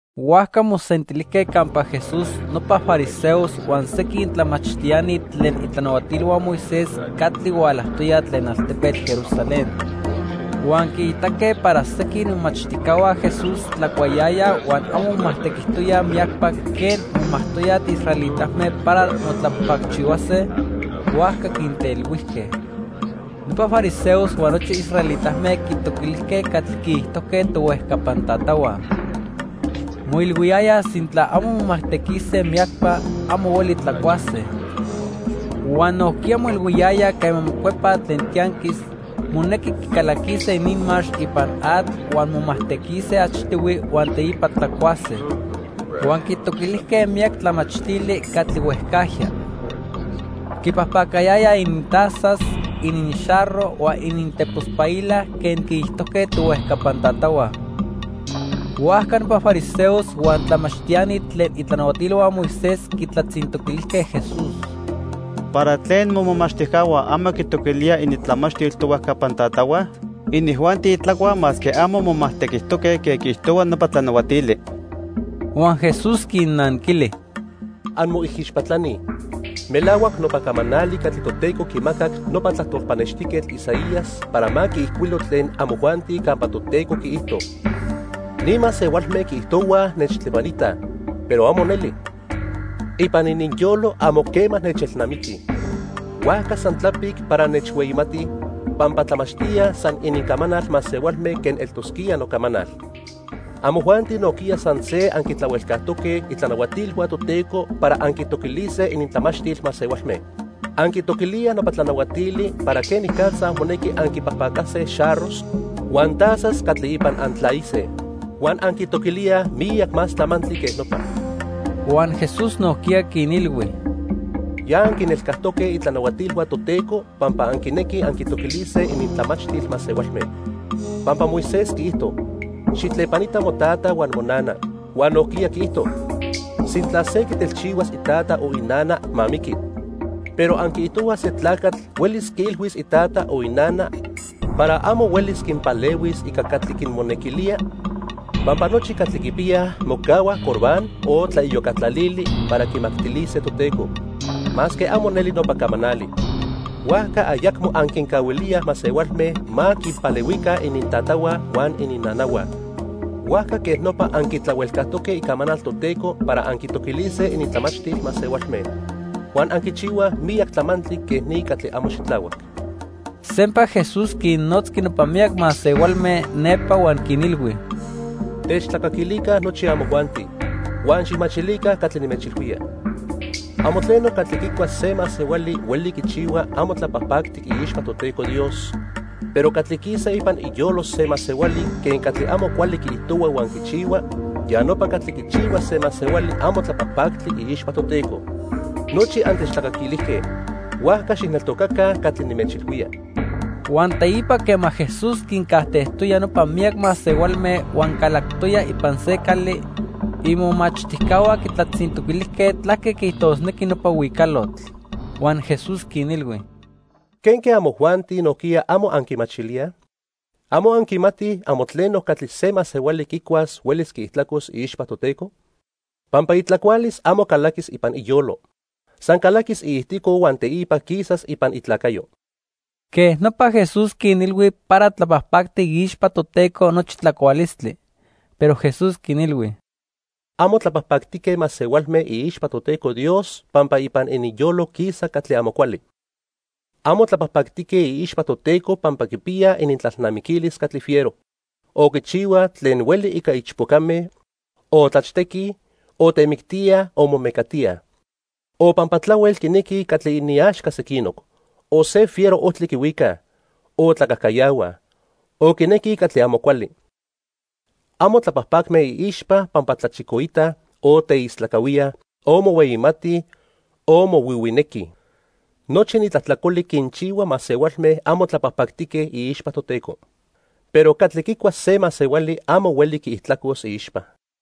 Huajca mosentilijque campa Jesús nopa fariseos huan sequin tlamachtiani tlen itlanahuatilhua Moisés catli hualajtoyaj tlen altepetl Jerusalén. Huan quiitaque para sequin imomachtijcahua Jesús tlacuayayaj huan amo momajtequijtoyaj miyacpa quen momajtoyaj israelitame para motlapajpacchihuase, huajca quintelhuijque. Nopa fariseos huan nochi israelitame quitoquilijque catli quiijtojque tohuejcapan tatahua. Moilhuiyayaj sintla amo momajtequise miyacpa, amo hueli tlacuase. Huan nojquiya moilhuiyayaj quema mocuepaj tlen tianquis, monequi quicalaquise ininmax ipan atl huan momajtequise achtihui huan teipa tlacuase. Huan quitoquilijque miyac tlamachtili catli huejcajya. Quipajpacayayaj inintazas, ininxarro huan inintepospaila quen quiijtojque tohuejcapan tatahua. Huajca nopa fariseos huan tlamachtiani tlen itlanahuatilhua Moisés quitlatzintoquilijque Jesús: —¿Para tlen momomachtijcahua amo quitoquilíaj inintlamachtil tohuejcapan tatahua? Inijuanti tlacuaj masque amo momajtequijtoque quen quiijtohua nopa tlanahuatili. Huan Jesús quinnanquili: —¡Anmoijixpatlani! Melahuac nopa camanali catli Toteco quimacac nopa tlajtol pannextijquetl Isaías para ma quiijcuilo tlen amojuanti campa Toteco quiijto: 'Ni masehualme quiijtohuaj nechtlepanitaj, pero amo neli. Ipan ininyolo amo quema nechelnamiquij. Huajca san tlapic para nechhueyimatij, pampa tlamachtíaj san inincamanal masehualme quen eltosquía nocamanal.' Amojuanti nojquiya san se anquitlahuelcajtoque itlanahuatilhua Toteco para anquitoquilise inintlamachtil masehualme. Anquitoquilíaj nopa tlanahuatili para quenicatza monequi anquipajpacase xarros huan tazas catli ipan antlaise. Huan anquitoquilíaj miyac más tlamantli quej nopa. Huan Jesús nojquiya quinilhui: —Ya anquinelcajtoque itlanahuatilhua Toteco pampa anquinequij anquitoquilise inintlamachtil masehualme. Pampa Moisés quiijto: 'Xijtlepanita motata huan monana', huan nojquiya quiijto: 'Sintla se quitelchihuas itata o inana, ma miqui.' Pero anquiijtohuaj se tlacatl huelis quiilhuis itata o inana para amo huelis quinpalehuis ica catli quinmonequilía pampa nochi catli quipiyaj mocahua Corbán o tlaiyocatlalili para quimactilise Toteco, masque amo neli nopa camanali. Huajca ayacmo anquincahuilíaj masehualme ma quinpalehuica inintatahua huan ininnanahua. Huajca quej nopa anquitlahuelcajtoque icamanal Toteco para anquitoquilise inintlamachtil masehualme. Huan anquichihuaj miyac tlamantli quej ni catli amo xitlahuac. Sempa Jesús quinnotzqui nopa miyac masehualme nepa huan quinilhui: —Techtlacaquilica nochi amojuanti, huan xijmachilica catli nimechilhuía. Amo tleno catli quicua se masehuali hueli quichihua amo tlapajpactic iixpa Toteco Dios. Pero catli quisa ipan iyolo se masehuali quen catli amo cuali quiijtohua huan quichihua, ya nopa catli quichihua se masehuali amo tlapajpactli iixpa Toteco. Nochi antechtlacaquilijque, huajca xijneltocaca catli nimechilhuía. Huan teipa quema Jesús quincajtejtoya nopa miyac masehualme huan calactoya ipan se cali, imomachtijcahua quitlatzintoquilijque tlaque quiijtosnequi nopa huicalotl. Huan Jesús quinilhui: —¿Quenque amojuanti nojquiya amo anquimachilíaj? ¿Amo anquimatij amo tleno catli se masehuali quicuas huelis quiijtlacos iixpa Toteco? Pampa itlacualis amo calaquis ipan iyolo. San calaquis iijtico huan teipa quisas ipan itlacayo. Quej nopa Jesús quinilhui para tlapajpactic iixpa Toteco nochi tlacualistli. Pero Jesús quinilhui: —Amo tlapajpactique masehualme iixpa Toteco Dios pampa ipan ininyolo quisa catli amo cuali. Amo tlapajpactique iixpa Toteco pampa quipiyaj inintlalnamiquilis catli fiero, o quichihuaj tlen hueli ica ichpocame, o tlachtequij, o temictíaj o momecatíaj. O pampa tlahuel quinequij catli iniaxca sequinoc, o se fiero ojtli quihuicaj, o tlacajcayahuaj, o quinequij catli amo cuali. Amo tlapajpacme iixpa pampa tlachicoitaj, o teistlacahuíaj, o mohueyimatij o mohuihuinequij. Nochi ni tlajtlacoli quinchihua masehualme amo tlapajpactique iixpa Toteco. Pero catli quicua se masehuali amo hueli quiijtlacos iixpa.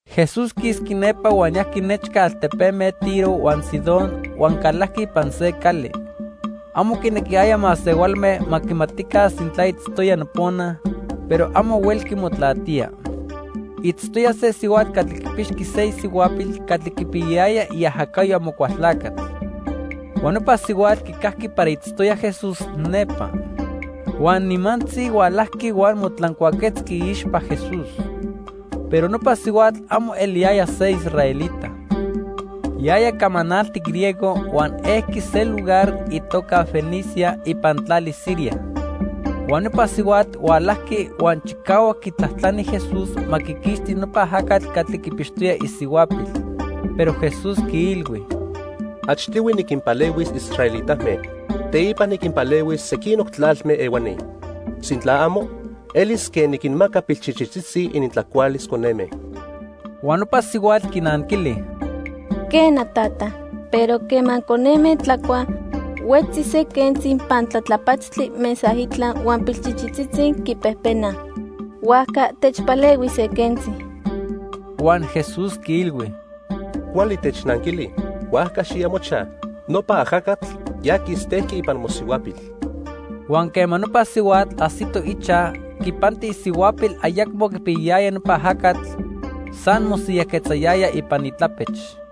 Jesús quisqui nepa huan yajqui nechca altepeme Tiro huan Sidón huan calajqui ipan se cali. Amo quinequiyaya masehualme ma quimatica sintla itztoya nopona, pero amo huelqui motlatía. Itztoya se sihuatl catli quipixqui se isihuapil catli quipiyayaya iajacayo Amocualtlacatl. Huan nopa sihuatl quicajqui para itztoya Jesús nepa. Huan nimantzi hualajqui huan motlancuaquetzqui iixpa Jesús. Pero nopa sihuatl amo eliyaya se israelita. Yaya camanaltic griego huan ejqui se lugar itoca Fenicia ipan tlali Siria. Huan nopa sihuatl hualajqui huan chicahuac quitlajtlani Jesús ma quiquixti nopa ajacatl catli quipixtoya isihuapil. Pero Jesús quiilhui: —Achtihui niquinpalehuis israelitame. Teipa niquinpalehuis sequinoc tlalme ehuani. Sintla amo, elis quen niquinmaca pilchichitzitzi inintlacualis coneme. Huan nopa sihuatl quinanquili: —Quena, tata, pero quema coneme tlacuaj, huetzi se quentzi pantlatlapatztli mesaitla huan pilchichitzitzi quipejpenaj. Huajca techpalehui se quentzi. Huan Jesús quiilhui: —Cuali technanquili, huajca xiya mochaj; nopa ajacatl ya quistejqui ipan mosihuapil. Huan quema nopa sihuatl ajsito ichaj, quipanti isihuapil ayacmo quipiyayaya nopa ajacatl, san mosiyajquetzayaya ipan itlapech.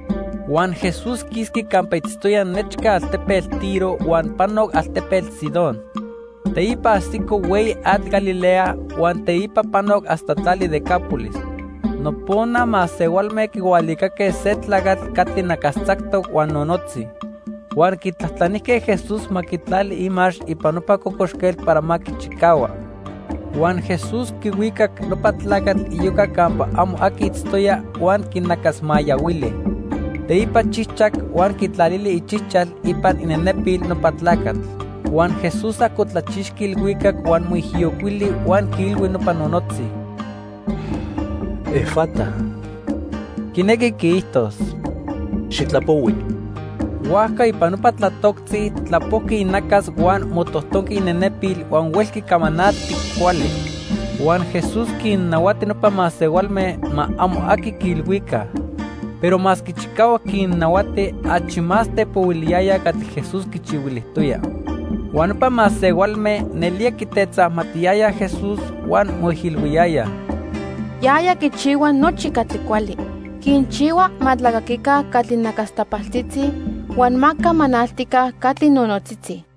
Huan Jesús quisqui campa itztoya nechca altepetl Tiro huan panoc altepetl Sidón. Teipa ajsico hueyi atl Galilea huan teipa panoc hasta tlali Decápolis. Nopona masehualme quihualicaque se tlacatl catli nacastzactoc huan nonotzi, huan quitlajtlanijque Jesús ma quitlali imax ipan nopa cocoxquetl para ma quichicahua. Huan Jesús quihuicac nopa tlacatl iyoca campa amo aqui itztoya, huan quinacasmayahuili. Teipa chijchac huan quitlalili ichijchal ipan inenepil nopa tlacatl. Huan Jesús ajcotlachixqui ilhuicac huan moijiyocuili huan quiilhui nopa nonotzi: "¡Efata!" (quinequi quiijtos: "¡Xitlapohui!") Huajca ipan nopa tlatoctzi tlapojqui inacas huan motojtonqui inenepil huan huelqui camanalti cuali. Huan Jesús quinnahuati nopa masehualme ma amo aqui quiilhuica. Pero masque chicahuac quinnahuati, achi más tepohuiliyayaj catli Jesús quichihuilijtoya. Huan nopa masehualme nelía quitetzamatiyayaj Jesús huan moijilhuiyayaj: "Yaya quichihua nochi catli cuali. Quinchihua ma tlacaquica catli nacastapaltzitzi huan ma camanaltica catli nonotzitzi."